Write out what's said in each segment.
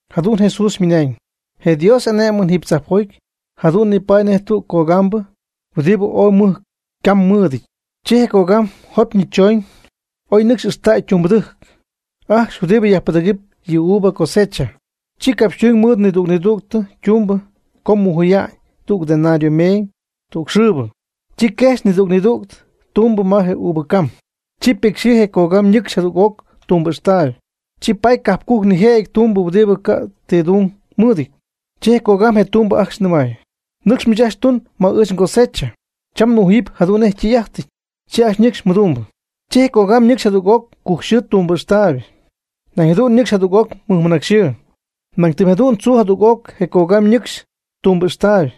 Jadu'n Jesús ymɨnañ: ―Je Dios y'ane'mɨn jiiby tzajpjoty jadu'n nipaady nej tüg cogambɨ huɨdibɨ ooy mɨj cam mɨɨdɨty. Chi je cogam jopyñɨ choñ ma oy nɨcxy ixtäy tumbɨdɨjc ajcxy huɨdibɨ yajpɨdɨ̈gɨpy yɨ uva cosecha. Chi ycapxytuñ mɨɨd nidüg nidüg ytumbɨ co mujuya'ñ tüg denario meeñ tüg xɨɨbɨ. Chi quejxy nidüg nidüg ytumbɨ ma je uva cam. Chi petyxɨɨ je cogam ñɨcxy jadüg'oc tumbɨ ixtaayb. Chi paty cajp cujc nijëjɨty tumbɨ huɨdibɨ ca' ti tung mɨɨdɨty. Chi je cogam je tumbɨ ajcxy nɨmay: “Nɨcx miich ajcxy tuñ ma ɨɨch ngosecha. Cham nmujuyɨpy jadu'n nej ytɨy'ajtɨty.” Chi ñɨcxy ajcxy mɨdumbɨ. Chi je cogam ñɨcxy jadüg'oc cujcxɨɨ tumbɨ ijxtaayb. Nañ jadu'n nɨcxy jadüg'oc mɨnacyxɨɨ. Nañ tɨm jadu'n tzuu jadüg'oc je cogam ñɨcxy tumbɨ ijxtaayb,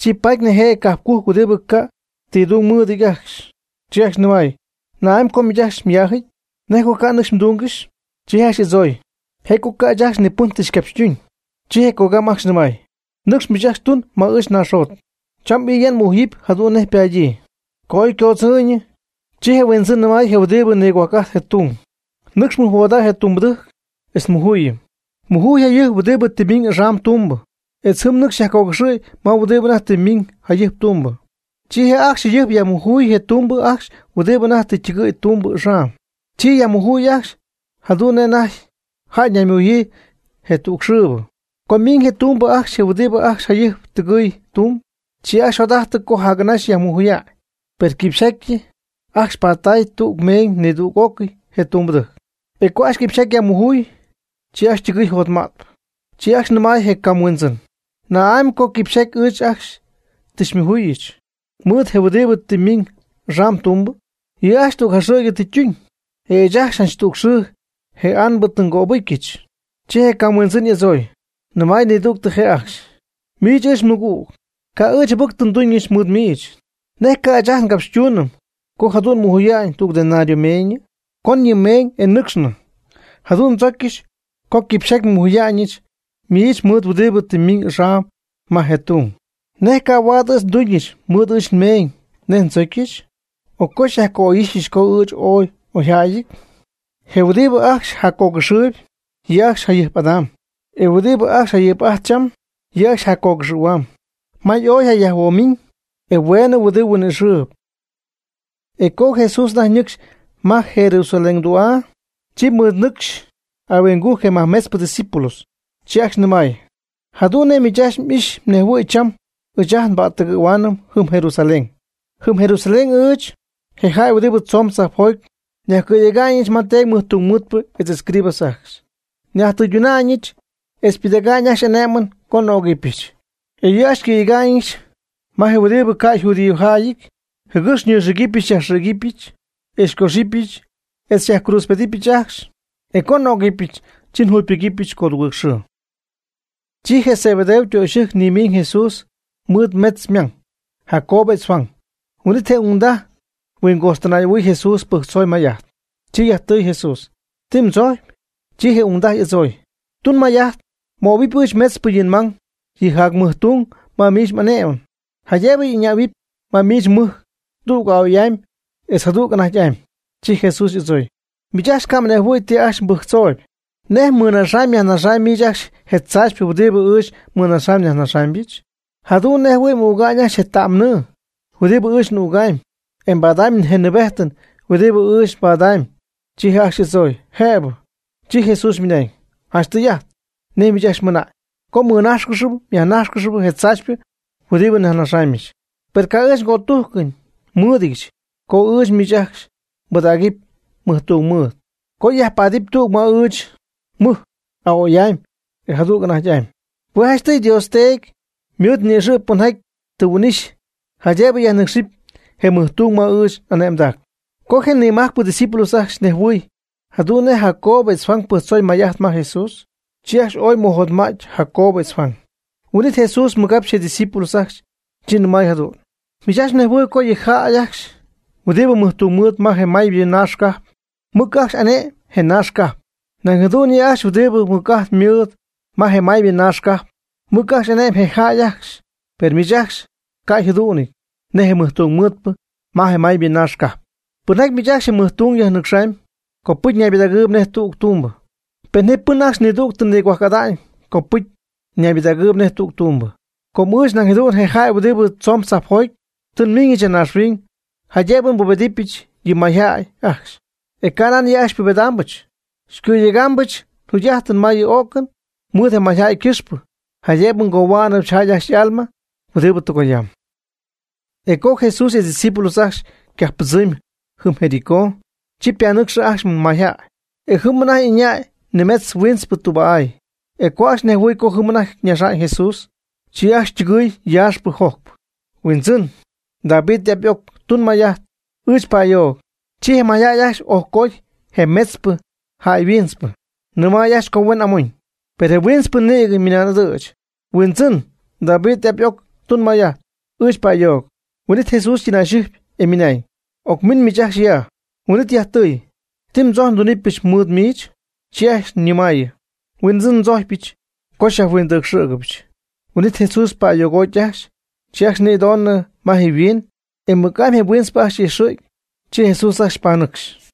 chi paty nijëjɨty cajpcujc huɨdibɨ ca' ti tung mɨɨdɨty ajcxy, chi ajcxy nɨmay: “¿Na'amy co miich ajcxy myaajɨty? ¿Nej co ca' mnɨcxy mdungɨxy?” Chi je' ajcxy y'adzooy: “Je' co ca' ɨɨch ajcxy pɨn tɨ xycapxytuñ.” Chi je cogam ajcxy nɨmay: “Nɨcx miich ajcxy tun ma ɨɨch nnaaxjot. Cham ɨya nmujuyɨpy jadu'n nej ypaadyii.” Co oy ycodzɨɨyñɨ, chi je huindzɨn nɨmay je huɨdibɨ nigop'ajtp je tung: “Nɨcx mɨjhuoodäy je tumbɨdɨjc etz mujuyɨpy. Mujuy jayɨjp huɨdibɨ tɨ ymiiñ axam tumbɨ etz jɨm nɨcxy myajcogɨxɨ̈y ma huɨdibɨ anajty tɨ miiñ jayɨjp tumbɨ.” Chi ajcxy jayɨjp yajmujuy je tumbɨ ajcxy huɨdibɨ anajty tɨ ytɨgɨɨy tumbɨ axam. Chi yajmujuy ajcxy jadu'n nej anajty jäy ñaymujuyii je tüg xɨɨbɨ. Co miiñ je tumbɨ ajcxy je huɨdibɨ ajcxy jayɨjp tɨgɨɨy tumb. Chi ajcxy jot'ajtɨ co jac'anaxy yajmujuya'ñ. Per quipxyjaty ajcxy paty tüg meeñ nidüg'ócɨy je tumbɨdɨjc. E co ajcxy quipxyjaty yajmujuy, chi ajcxy ytɨgɨɨy jotma'tpɨ. Chi ajcxy nɨmay je cam huindzɨn: “¿Na'amy co quipxyjaty ɨɨch ajcxy tɨ xymujuyɨch mɨɨd je huɨdibɨ tɨ miiñ axam tumbɨ? Yɨ' ajcxy tüg jaxɨ̈gy tɨ ytuñ, e ɨɨch ajcxy tüg xɨɨ je anbɨ tɨ ngöbɨcyɨch.” Chi je cam huindzɨn y'adzooy, nɨmay nidügtɨ je' ajcxy: “Miich, ɨɨch nmɨgüg, ca' ɨɨch jɨbɨc tɨ nduñɨch mɨɨd miich. ¿Nej ca' ɨɨch ajt ngapxytuunɨm co jadu'n nmujuya'ñ tüg denario meeñɨ? Con yɨ mmeeñ, e nɨcxnɨ. Jadu'n ndzocyɨch co quipxyjaty nmujuya'ñɨch miich mɨɨd huɨdibɨ tɨ ymiñ axam ma je tung. ¿Nej ca' huaad ɨɨch nduñɨch mɨɨd ɨɨch nmeeñ nej ndzócyɨchɨ? ¿O co xyajca'oy'ixyɨch, co ɨɨch ooy n'oyjäyɨty?” E huɨdibɨ ajcxy jaccogɨxɨɨyb, yɨ' ajcxy jayɨjp'adam. E huɨdibɨ ajcxy jayɨjp'ajtp cham, yɨ' ajcxy yjaccogɨxɨ̈huamb. May ooy yjayajhuoomiñ e hueenɨ huidɨ huin'íjxɨpy. E co Jesús anajty ñɨcxy ma Jerusalén tü'aa, chi mɨɨd nɨcxy ahuingujc je nimajmetzpɨ ydiscípulos. Chi ajcxy nɨmay: ―Jadu'n nej miich ajcxy m'ijxy mnejhuɨ̈y cham ɨɨch ajt nba'ttɨgɨɨyɨm jɨm Jerusalén. Jɨm Jerusalén ɨɨch, je jäy huɨdibɨ tzoon tzajpjoty, xyajcɨ̈yegaamɨch je teedy mɨjtungmɨɨdpɨ etz escribas ajcxy. Nyajtɨyduna'ñɨch etz pɨdäga'ñ ajcxy ané'mɨn co n'ögɨbɨch. E yɨ' ajcxy xycɨ̈yega'ñɨch ma je huɨdibɨ ca' yjudiojäyɨty, jɨgɨx xyñixïgɨbɨch xyajxïgɨbɨch, xycoxɨpɨch, etz xyajcruutzpedɨpɨch ajcxy. E co n'ögɨbɨch, chi njugypɨgɨpyɨch codugɨɨg xɨɨ. Chi je Zebedeo ytöxyɨjc nimiiñ Jesús mɨɨd metz je ymang; Jacobo etz Juan. Huin'it je ungdaj huingojxtɨnay'ɨhuɨɨy Jesús, pɨjctzoy may'ajt. Chi yajtɨɨy Jesús: ―¿Ti mdzojcpy? Chi je ungdaj y'adzooy: ―Tun may'ajt möhuɨpy ɨɨch metzpɨ yɨ nmang yɨ jacmɨjtung ma miich m'ane'mɨn, jaydëb ɨñähuɨpy ma miich mmɨjc, tüg a'oy'amy etz jadüg anajty'amy. Chi Jesús y'adzooy: ―Miich ajcxy ca' mhuinjɨhuɨ̈y ti ajcxy mbɨjctzooyb. ¿Nej mmɨnaxa'ñ myajnaxa'ñ miich ajcxy je tzaachypɨ huɨdibɨ ɨɨch nmɨnaxamy nyajnaxamyɨch? Jadu'n nej jɨhuɨ̈y m'üga'ñ ajcxy je ta'm nɨɨ huɨdibɨ ɨɨch n'ügamy e mbaada'ñ je nɨɨbejtɨn huɨdibɨ ɨɨch nbadamyb. Chi je' ajcxy y'adzooy: ―Jëbɨ. Chi Jesús ymɨna'ñ: ―Janch tɨy'ajt nej miich ajcxy mɨna'ñ co mmɨnájxcɨxɨpy myajnájxcɨxɨpy je tzaachypɨ huɨdibɨ nnaxa'ñɨch. Per ca' ɨɨch cötujcɨn nmɨɨdɨdyɨch co ɨɨch miich ajcxy nbɨdägɨpy mɨjtungmɨɨd, co myajpaadɨp tüg ma ɨɨch nmɨjc a'oy'amy e jadüg anajty'amy. Hue' janchtɨy Dios Teedy ymɨɨd ni'ixɨ' pɨnjaty tɨ huin'ixy jaydëb yajnɨcxɨp je mɨjtung ma ɨɨch n'ane'mdac. Co je nimajcpɨ ydiscípulos ajcxy nejhuɨɨy jadu'n nej Jacobo etz Juan pɨjctzooy may'ajt ma Jesús, chi ajcxy ooy mɨjotma'ty Jacobo etz Juan. Huin'it Jesús mɨjcapxy je' ydiscípulos ajcxy, chi nɨmay jadu'n: ―Miich ajcxy mnejhuɨy co yɨ jäy ajcxy huɨdibɨ mɨjtungmɨɨdpɨ ma je maybɨ naax cajp, mɨc ajcxy ane'my je naax cajp. Nañ jadu'n yɨ' ajcxy huɨdibɨ mɨc'ajt mɨɨd ma je maybɨ naax cajp, mɨc ajcxy ane'my je jäy ajcxy. Per miich ajcxy ca' mjadu'nɨty nej je mɨjtungmɨɨdpɨ ma je maybɨ naax cajp. Pɨnjaty miich ajcxy je mɨj tung yajnɨcxɨp, copɨcy ñaybɨdägɨɨyb nej tüg tumbɨ. Pen ji miich ajcxy nidüg nigohuajc'ada'ñ, copɨcy ñaybɨdägɨɨyb nej tüg tumbɨ. Com ɨɨch nañ jadu'n, je jäy huɨdibɨ tzoon tzajpjoty, tɨ nmiiñɨch ya naaxhuiñ jaydëbɨ nbubedɨpyɨch yɨ mayjäy ajcxy. E canan yɨ' ajcxy xypubedɨpɨch. Ngɨ̈yegaamyɨch njugy'ajtɨn ma yɨ o'cɨn mɨɨd je mayjäy ycɨxpɨ, jaydëbɨ ngohua'nɨch jäy ajcxy y'alma huɨdibɨ tɨgoyam. E co Jesús etz ydiscípulos ajcxy ycajppɨdzɨmy jɨm Jericó, chi ypanɨcxɨ ajcxy mayjäy. E jɨm anajty ɨñaay nimetz huintzpɨ tüba'áy. E co ajcxy nejhuɨɨy co jɨm anajty ñaxy Jesús, chi ajcxy yaaxpɨ jojcpɨ: ―Huindzɨn, David y'ap y'oc, tun may'ajt ɨɨch pa'ayoog. Chi je mayjäy ajcxy ojcooty je metzpɨ jäy huintzpɨ, nɨmay ajcxy co huen amoñ. Per je huintzpɨ nïgɨ mɨnan'ɨdɨ̈ch: ―Huindzɨn, David y'ap y'oc, tun may'ajt ɨɨch pa'ayoog. Huin'it Jesús ytɨnayxɨjp, e ymɨnañ: ―Ocmin miich ajcxy ya. Huin'it yajtɨɨy: ―¿Ti mdzojcpy ndunɨpyɨch mɨɨd miich? Chi ajcxy ñɨmaayɨ: ―Huindzɨn, ndzojcpyɨch co xyajhuindɨcxɨ̈gɨbɨch. Huin'it Jesús pa'ayoogoty ajcxy. Chi ajcxy nïdonɨ ma je' yhuiin, e mɨc'amy je huintzpɨ ajcxy y'ijxɨ̈gy. Chi Jesús ajcxy panɨcxy.